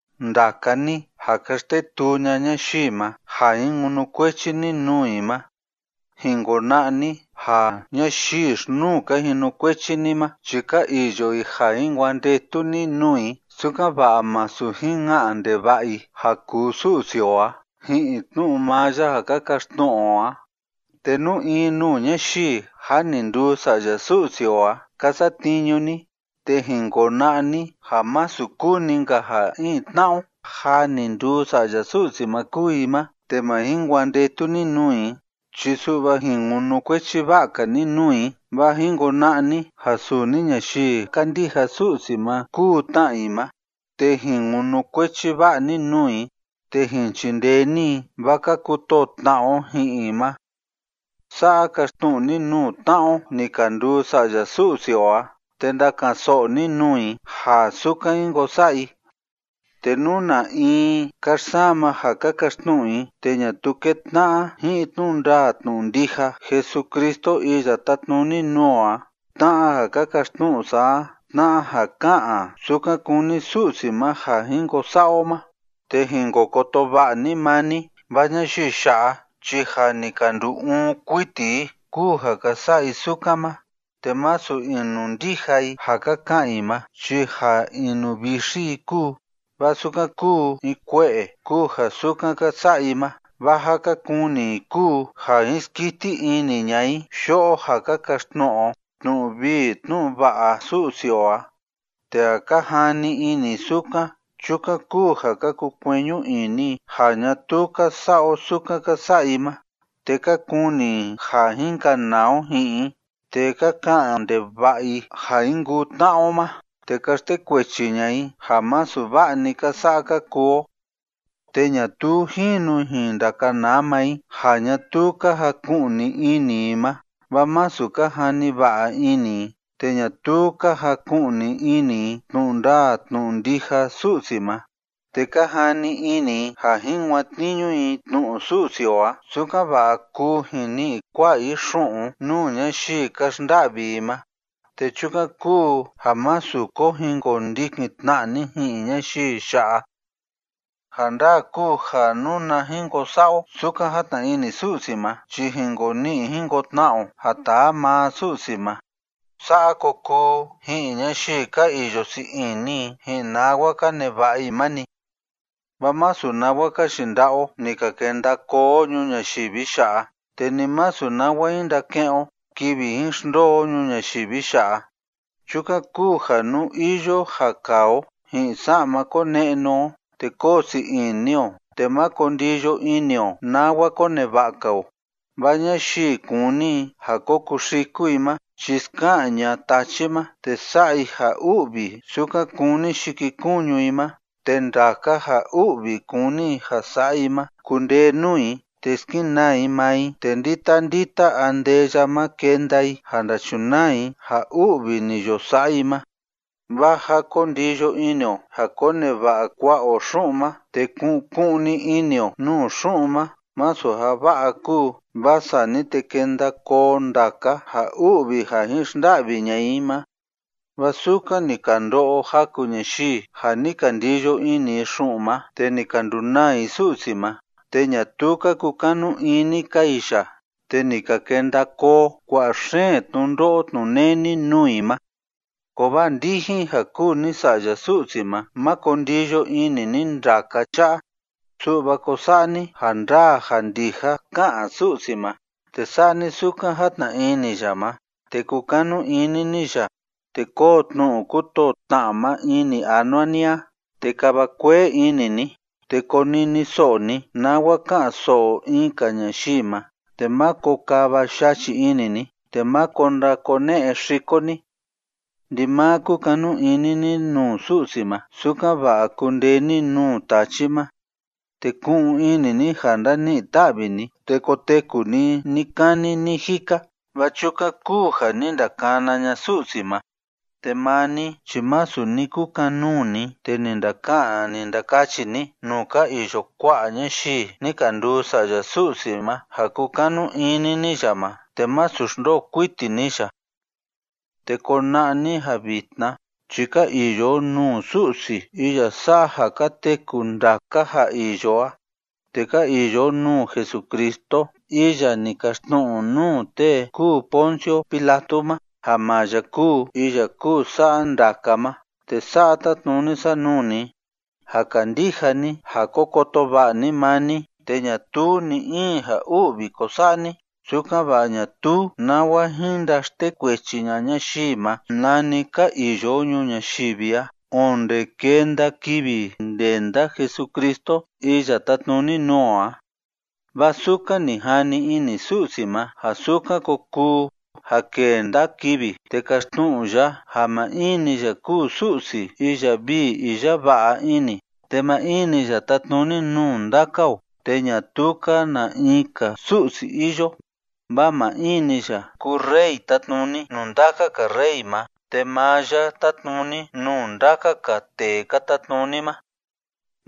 Ndaka ni ja ka xtetuu ña'a ñayii ma ja jin kunukuechi ni nuu i ma, jin kona'a ni ja ñayii xi‑nuu ka jinukuechi ni ma chi ka iyo i ja jin kuandetu ni nuu i, sukan‑va'a másu jin ka'an ndeva'a i ja kuu Su'si o a ji'in tnu'u maa ya ja ka kaxtnu'u o a. Te nú in nuu ñayii jâ ni nduu sa'ya Su'si o a ka satniñu ni, te jin kona'a ni ja masu kuu‑ni‑nka ja in tna'a o jâ ni nduu sa'ya Su'si ma kúu i ma te ma jin kuandetu ni nuu i chi su'va jin kunukuechi va'a‑ka ni nuu i, vaa jin kona'a ni ja suni ñayii kándija Su'si ma kúu tna i ma, te jin kunukuechi va'a ni nuu i, te jin chindee ni i, vaa ka kutoo tna'a o ji'in i ma. Sa'a kaxtnu'u ni nuu tna'a o ni ka nduu sa'ya Su'si o a, te ndaka'an‑so'o ni nuu i ja sukan jin ko sa'a i. Te nú na in ka xsama ja ka kaxtnu'u i te ñatuu kétna'a ji'in tnu'u ndaa tnu'u ndija Jesucristo iya tátnuni nuu o a tna'a ja ka kaxtnu'u sa a, tna'a ja ká'an sukan kúni Su'si ma ja jin ko sa'a o ma, te jin ko koto va'a ni maa ni, vaa ñayii ya'a chi ja ni ka ndu‑uun kuiti i kúu ja ka sa'a i sukan ma, te masu inundija i ja ka ka'an i ma chi ja inuvixi i kúu, vaa sukan kúu in kue'e kúu ja sukan ka sa'a i ma, vaa ja ka kuni i kúu ja jin skiti ini ña'a i yo'o ja ka kaxtnu'u o tnu'u vii tnu'u va'a Su'si o a, te ja ka jani ini i sukan, chukan kúu ja ka kukueñu ini i ja ñatuu ka sa'a o sukan ka sa'a i ma, te ka kuni i ja jin kanaa o ji'in i, te ka ka'an ndeva'a i ja jin kuu tna'a o ma, te ka xtekuechi ña'a i ja masu va'a‑ni ka sa'a ka kuu o. Te ñatuu jínu jin ndakanaa maa i ja ñatuu ka jaku'ni ini i ma, vaa masu ka jani va'a ini i, te ñatuu ka jaku'ni ini i tnu'u ndaa tnu'u ndija Su'si ma. Te ka jani ini i ja jin kuatniñu i tnu'u Su'si o a, sukan‑va'a kuu jin ni'i kua'a i xu'un nuu ñayii ka xnda'vi i ma. Te chukan kúu ja másu ko jin kondikin tna'a ni ji'in ñayii ya'a. Ja ndaa kúu ja nuna jin ko sa'a o sukan játna ini Su'si ma chi jin ko ni'i jin ko tna'a o ja taa maa Su'si ma. Sa'a ko kuu ji'in ñayii ka iyo sii ini i ji'in nawa ka neva'a i ma‑ni. Vaa masu nawa ka yinda'a o ni ka kenda koo o ñuu ñayivi ya'a, te ni masu nawa jin ndake'en o kivi jin xndoo o ñuu ñayivi ya'a. Chukan kúu ja nú iyo ja kaa o ji'in sa'ma kone'nu o, te koo sii ini o, te máko ndiyo ini o nawa koneva'a‑ka o. Vaa ñayii kúni i ja ko kuxiku i ma chi ska'an ña'a tachi ma, te sa'a i ja u'vi sukan kúni yikikuñu i ma, te ndaka ja u'vi kúni i ja sa'a i ma kundee nuu i, te skenaa i maa i, te ndita ndita andeya ma kenda i ja ndachunaa i ja u'vi ni yo sa'a i ma. Vaa ja ko ndiyo ini o ja koneva'a kua'a o xu'un ma te ku'un ku'un‑ni ini o nuu xu'un ma masu ja va'a kúu, vaa sani te kenda koo ndaka ja u'vi ja jin xnda'vi ña'a i ma. Vaa sukan ni ka ndo'o jaku ñayii ja ni ka ndiyo ini i xu'un ma, te ni ka ndunaa i Su'si ma, te ñatuu ka kukanu ini‑ka i ya, te ni ka kenda koo kua'a xeen tnundo'o tnuneni nuu i ma. Kovaa ndijin ja kúu ni sa'ya Su'si ma, má ko ndiyo ini ni ndaka cha'a, su'va ko sa'a ni ja ndaa ja ndija ká'an Su'si ma, te sa'a ni sukan játna ini ya ma, te kukanu ini ni ya, te kóo tnu'u kútoo tna'a ma ini anua ni a, te kava kuee ini ni, te koniniso'o ni nawa ka'an‑so'o in‑ka ñayii ma, te máko kava yachi ini ni, te máko ndakone'e xiko ni. Ndimaa kukanu ini ni nuu Su'si ma, sukan‑va'a kundee ni nuu tachi ma. Te ku'un ini ni ja ndani'i ta'vi ni te koteku ni ni‑kani ni‑jika, vaa chukan kúu ja ni ndakana ña'a Su'si ma, te maa ni chi masu ni kukan‑nuu ni te ni ndaka'an ni ndakachi ni nuu ka iyo kua'a ñayii ni ka nduu sa'ya Su'si ma ja kúkanu ini ni ya ma te másu xndoo kuiti ni ya. Te kona'a ni ja vitna chi ka iyo o nuu Su'si iya sa'a ja ka teku ndaka ja iyo a, te ka iyo o nuu Jesucristo iya ni kaxtnu'u nuu tee kúu Poncio Pilato ma ja maa ya kúu iya kúu sa'a ndaka ma, te sa'a tátnuni sa nuu ni, ja kandija ni ja ko koto va'a ni maa ni, te ñatuu ni‑in ja u'vi ko sa'a ni, sukan‑va'a ñatuu nawa jin ndaxtekuechi ña'a ñayii ma, nani ka iyo o ñuu ñayivi a onde kenda kivi ndenda Jesucristo iya tátnuni nuu o a. Vaa sukan ni jani ini Su'si ma ja sukan ko kuu ja kenda kivi, te kaxtnu'u ya ja maa in‑ni ya kúu Su'si iya vii iya va'a ini, te maa in‑ni ya tátnuni nuu ndaka o, te ñatuu‑ka na in‑ka Su'si iyo, vaa maa in‑ni ya kúu Rey tátnuni nuu ndaka‑ka rey ma, te maa ya tátnuni nuu ndaka‑ka tee ka tatnuni ma.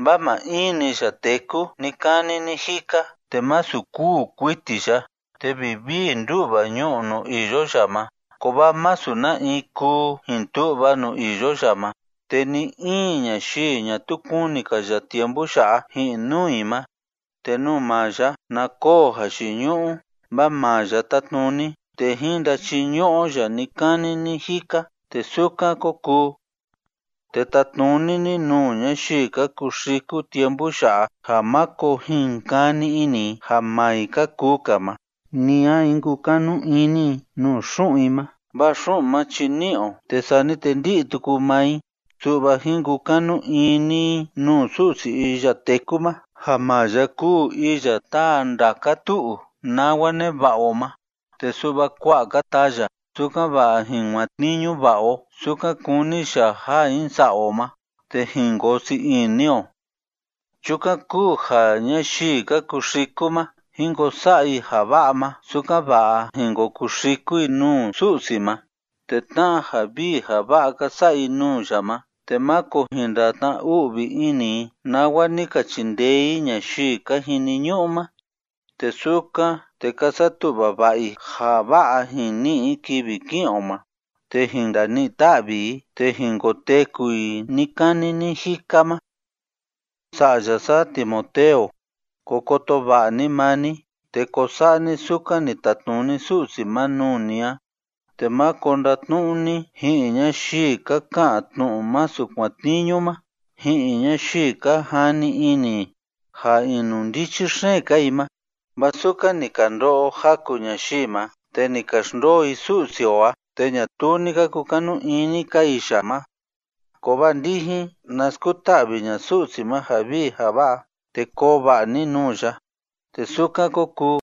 Vaa maa in‑ni ya téku ni‑kani ni‑jika, te masu kûu kuiti ya, te vivii ndú'va ñu'u nuu iyo ya ma, kovaa masu na in kuu jin tu'va nuu iyo ya ma, te ni‑in ñayii ñatuu kuni‑ka ya tiempu ya'a ji'in nuu i ma. Te nuu maa ya na koo jayiñu'u, vaa maa ya tátnuni, te jín ndachiñu'u o ya ni‑kani ni‑jika. Te sukan kó kuu. Te tatnuni ni nuu ñayii ka kuxiku tiempu ya'a ja máko jin kani ini i ja maa i ka kuu‑ka ma, ni a jin kukanu ini i nuu xu'un i ma. Vaa xu'un ma chi ní'i o, te sani te ndí'i tuku maa i. Su'va jín kukanu ini i nuu Su'si iya téku ma ja maa ya kúu iya táa ndaka tu'u nawa neva'a o ma, te su'va kua'a‑ka taa ya, sukan‑va'a jin kuatniñu va'a o sukan kúni ya ja jin sa'a o ma, te jin koo sii ini o. Chukan kúu ja ñayii ka kuxiku ma, jín ko sa'a i ja va'a ma, sukan‑va'a jín ko kuxiku i nuu Su'si ma, te tna'a ja vii ja va'a ka sa'a i nuu ya ma, te máko jin ndatna‑u'vi ini i nawa ni ka chindee i ñayii ka jiniñu'u ma. Te sukan, te ka satu'va va'a i ja va'a jin ni'i i kivi ki'in o ma, te jin ndani'i ta'vi i te jin koteku i ni‑kani ni‑jika ma. Sa'ya sa Timoteo, ko koto va'a ni maa ni, te ko sa'a ni sukan ni tatnuni Su'si ma nuu ni a. Te máko ndatnu'u ni ji'in ñayii ka ka'an tnu'u masu kuatniñu ma, ji'in ñayii ka jani ini i ja inundichi xeen‑ka i ma. Vaa sukan ni ka ndo'o jaku ñayii ma, te ni ka xndoo i Su'si o a, te ñatuu ni ka kukanu ini‑ka i ya ma. Kovaa ndijin, na skuta'vi ña'a Su'si ma ja vii ja va'a, te koo va'a ni nuu ya. Te sukan kó kuu.